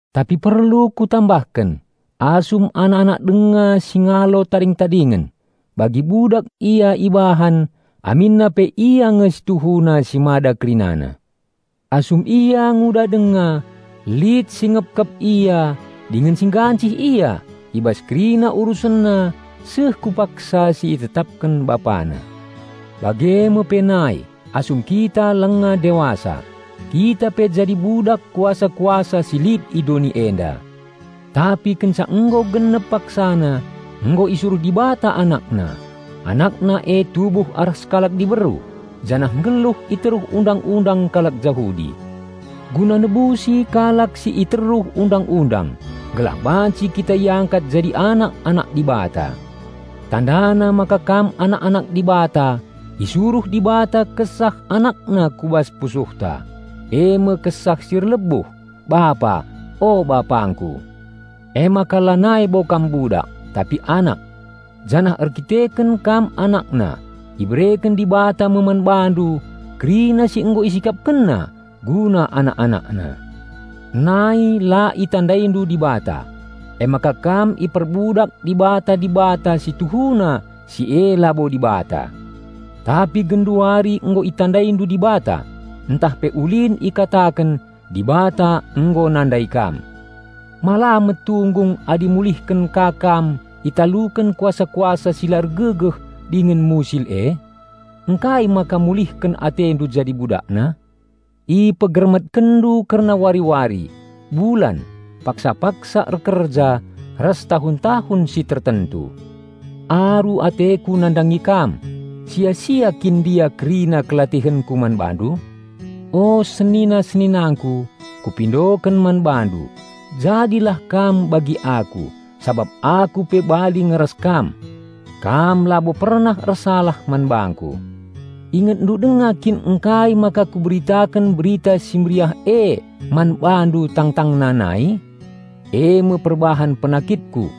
Tapi perlu kutambahken: Asum anak-anak denga si ngalo tading-tadingen, bagi budak ia ibahan aminna pe ia nge si tuhuna si mada kerinana. Asum ia nguda denga, lit si ngepkep ia dingen si nggancih ia i bas kerina urusenna seh ku paksa si itetapken bapana. Bage me pe nai, asum kita lenga dewasa, kita pe jadi budak kuasa-kuasa si lit i doni enda. Tapi kenca nggo genep paksana, nggo isuruh Dibata AnakNa. AnakNa e tubuh arah sekalak diberu, janah nggeluh i teruh Undang-undang kalak Jahudi. Guna nebusi kalak si i teruh Undang-undang, gelah banci kita iangkat jadi anak-anak Dibata. Tandana maka kam anak-anak Dibata, isuruh Dibata Kesah AnakNa ku bas pusuhta, eme Kesah si erlebuh, "Bapa, o Bapangku." Emaka lanai bo kam budak, tapi anak. Janah erdandanken kam AnakNa, ibereken Dibata me man bandu kerina si nggo IsikapkenNa guna anak-AnakNa. Nai la itandaindu Dibata, emaka kam iperbudak dibata-dibata situhuna si e labo Dibata. Tapi genduari nggo itandaindu Dibata ntah pe ulin ikataken Dibata nggo nandai kam; ma la metunggung adi mulihken ka kam italuken kuasa-kuasa si la ergegeh dingen musil e? Ngkai maka mulihken atendu jadi budakna? Ipegermetkenndu kerna wari-wari, bulan, paksa-paksa erkerja ras tahun-tahun si tertentu. Aru ateku nandangi kam. Sia-sia kin ndia kerina kelatihenku man bandu? O senina-seninangku, kupindoken man bandu: jadilah kam bagi aku, sabap aku pe bali nge ras kam. Kam labo pernah ersalah man bangku. Ingetndu denga kin ngkai maka kuberitaken Berita Si Mehuli e man bandu tangtangna nai? Eme perbahan penakitku.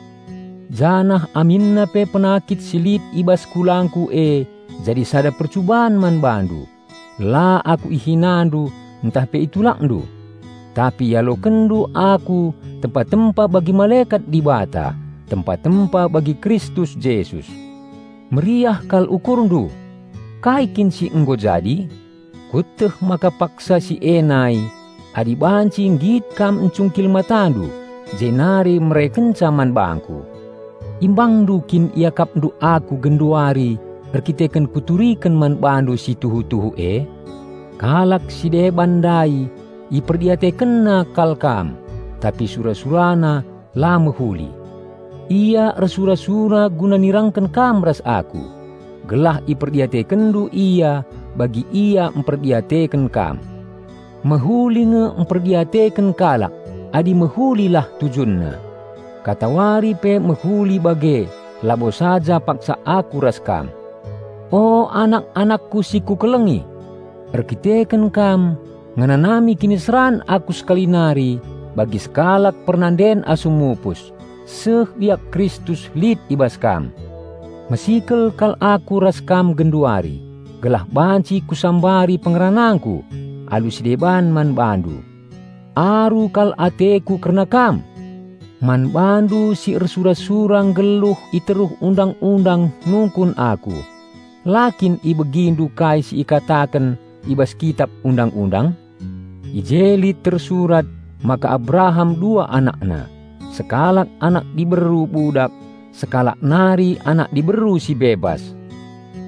Janah aminna pe penakit si lit i bas kulangku e jadi sada percuban man bandu, la aku ihinandu ntah pe itulakndu. Tapi ialokenndu aku tempa-tempa bagi malekat Dibata, tempa-tempa bagi Kristus Jesus. Meriah kal ukurndu! Kai kin si nggo jadi? Kueteh maka paksa si e nai, adi banci nggit kam ncungkil matandu jenari merekenca man bangku. Imbangndu kin iakapndu aku genduari erdandanken kuturiken man bandu si tuhu-tuhu e? Kalak si deban ndai iperdiatekenna kal kam, tapi sura-surana la mehuli. Ia ersura-sura guna nirangken kam ras aku, gelah iperdiatekenndu ia bagi ia mperdiateken kam. Mehuli nge mperdiateken kalak, adi mehulilah tujunna. Katawari pe mehuli bage labo saja paksa aku ras kam. O anak-anakku si kukelengi! Erdandanken kam, ngenanami kiniseran aku sekali nari bagi sekalak pernanden asum mupus, seh biak Kristus lit i bas kam. Mesikel kal aku ras kam genduari, gelah banci kusambari pengeranangku alu si deban man bandu. Aru kal ateku kerna kam! Man bandu si ersura-sura nggeluh i teruh Undang-undang nungkun aku: La kin ibegindu kai si ikataken i bas Kitap Undang-undang? I je lit tersurat maka Abraham dua anakna: Sekalak anak diberu budak, sekalak nari anak diberu si bebas.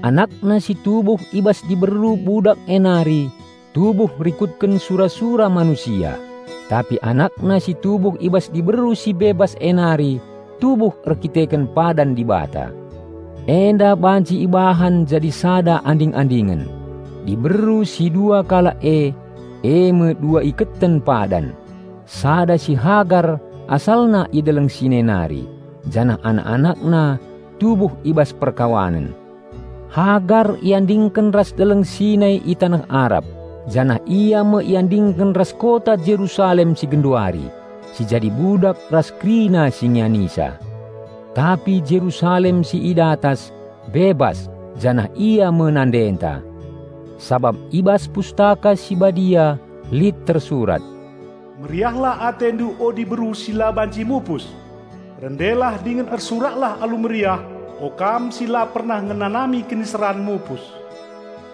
Anakna si tubuh i bas diberu budak e nari, tubuh rikutken sura-sura manusia, tapi anakna si tubuh i bas diberu si bebas e nari tubuh erdandanken padan Dibata. Enda banci ibahan jadi sada anding-andingen: diberu si dua kalak e, eme dua iketen padan, sada si Hagar asalna i Deleng Sinai nari, janah anak-anakna tubuh i bas perkawanen. Hagar iandingken ras Deleng Sinai i taneh Arab, janah ia me iandingken ras kota Jerusalem si genduari, si jadi budak ras kerina si ngianisa. Tapi Jerusalem si i datas, bebas, janah ia me nandeta. Sabap i bas Pustaka Si Badia lit tersurat: "Meriahlah atendu o diberu si la banci mupus! Rendelah dingen ersuraklah alu meriah, o kam si la pernah ngenanami kiniseran mupus!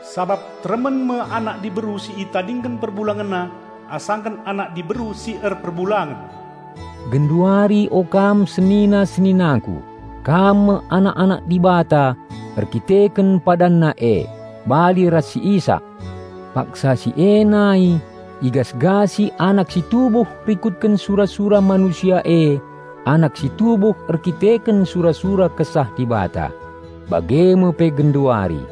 Sabap teremen me anak diberu si itadingken perbulangenna, asangken anak diberu si erperbulangen." Genduari o kam senina-seninangku, kam me anak-anak Dibata erdandanken PadanNa e, bali ras si Isak. Paksa si e nai igasgasi anak si tubuh rikutken sura-sura manusia e anak si tubuh erdandanken sura-sura Kesah Dibata. Bage me pe genduari.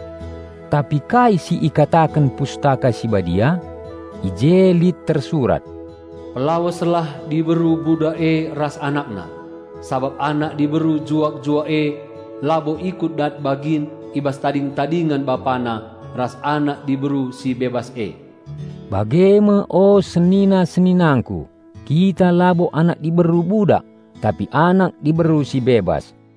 Tapi kai si ikataken Pustaka Si Badia? I je lit tersurat, "Pelaweslah diberu budak e ras anakna; sabap anak diberu juak-juak e labo ikut dat bagin i bas tading-tadingen bapana ras anak diberu si bebas e." Bage me o senina-seninangku, kita labo anak diberu budak tapi anak diberu si bebas.